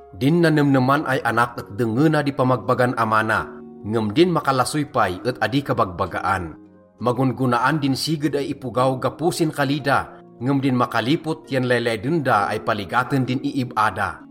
Din nanemneman ay anak et dengngena di pamagbagan ama na, ngem din makalasoy pay et adi kabagbagaan. Magon-gonaan din siged ay ipogaw gapo sin kali da, ngem din makalipot yan laylayden da ay paligaten din iib-a da.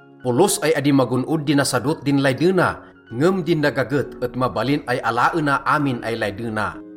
Polos ay adi magon-od di nasadot din laydena, ngem din nagaget et mabalin ay alaena amin ay laydena.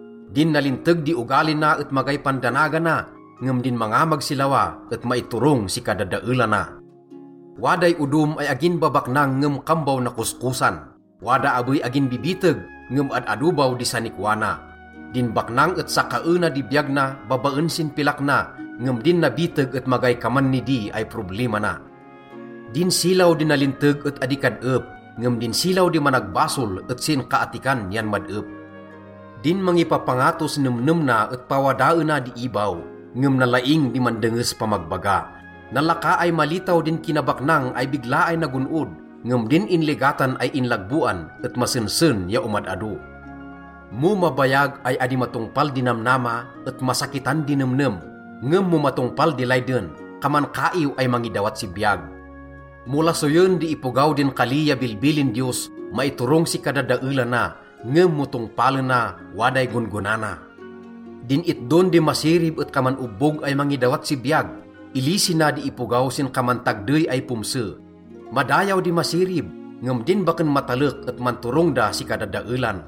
Din nalinteg di ogali na et magay pandanagana, ngem din mangamag si lawa et maiturong si kadadaelana. Waday odom ay agin babaknang ngem kambaw nakoskosan. Wada abey agin bibiteg ngem ad-ado baw di sanikwa na. Din baknang et sakaena di biyag na babaen sin pilak na, ngem din nabiteg et magay kaman nidi ay problima na. Din silaw di nalinteg et adi kad-ep, ngem din silaw di managbasol et sinkaattikan yan mad-ep. Din mangipapangatos nemnem na et pawadaena di ibaw, ngem nalaing di mandenges pamagbaga. Nalaka ay malitaw din kinabaknang ay bigla ay nagon-od, ngem din inligatan ay inlagboan et masensen ya omad-ado. Mo mabayag ay adi matongpal di namnama et masakitan di nemnem, ngem mo matongpal di layden, kaman kaiw ay mangidawat si biyag. Mo lasoyen di ipogaw din kali ya bilbilin Diyos, maiturong si kadadaelana, ngem mo tongpalena, waday gon-gona na. Din itdon di masirib et kaman obbog ay mangidawat si biyag. Ilisi na di ipogaw sin kaman tagdey ay pomse. Madayaw di masirib, ngem din baken matalek et manturong da si kadadaelan.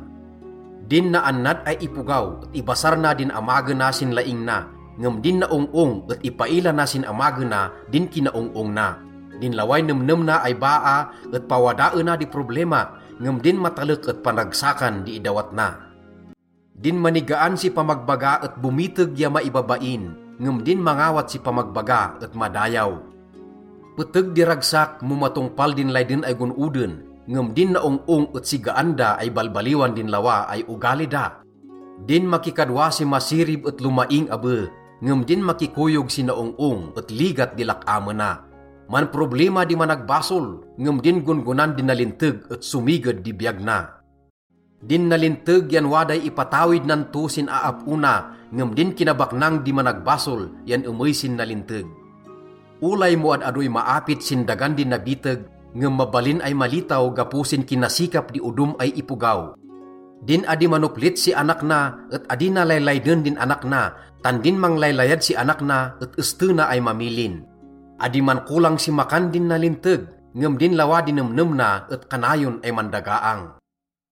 Din naannad ay ipogaw et ibasar na din amagena sin laing na, ngem din naong-ong et ipaila na sin amagena din kinaong-ong na. Din laway nemnem na ay baa et pawadaena di problima, ngem din matalek et panragsakan di idawat na. Din manigaan si pamagbaga et bomiteg ya maibabain, ngem din mangawat si pamagbaga et madayaw. Peteg di ragsak mo matongpal din layden ay gon-oden, ngem din naong-ong et sigaan da ay balbaliwan din lawa ay ogali da. Din makikadwa si masirib et lomaing abe, ngem din makikoyog si naong-ong et ligat di lak-amena. Manproblima di managbasol, ngem din gon-gonan di nalinteg et somiged di biyag na. Din nalinteg yan waday ipatawid nan to sin aap-o na, ngem din kinabaknang di managbasol yan emey sin nalinteg. Olay mo ad-adoy maapit sin dagan di nabiteg, ngem mabalin ay malitaw gapo sin kinasikap di odom ay ipogaw. Din adi manoplit si anak na et adi na laylayden din anak na, tan din manglaylayad si anak na et estena ay mamilin. Adi mankolang si makan din nalinteg, ngem din lawa di nemnem na et kanayon ay mandagaang.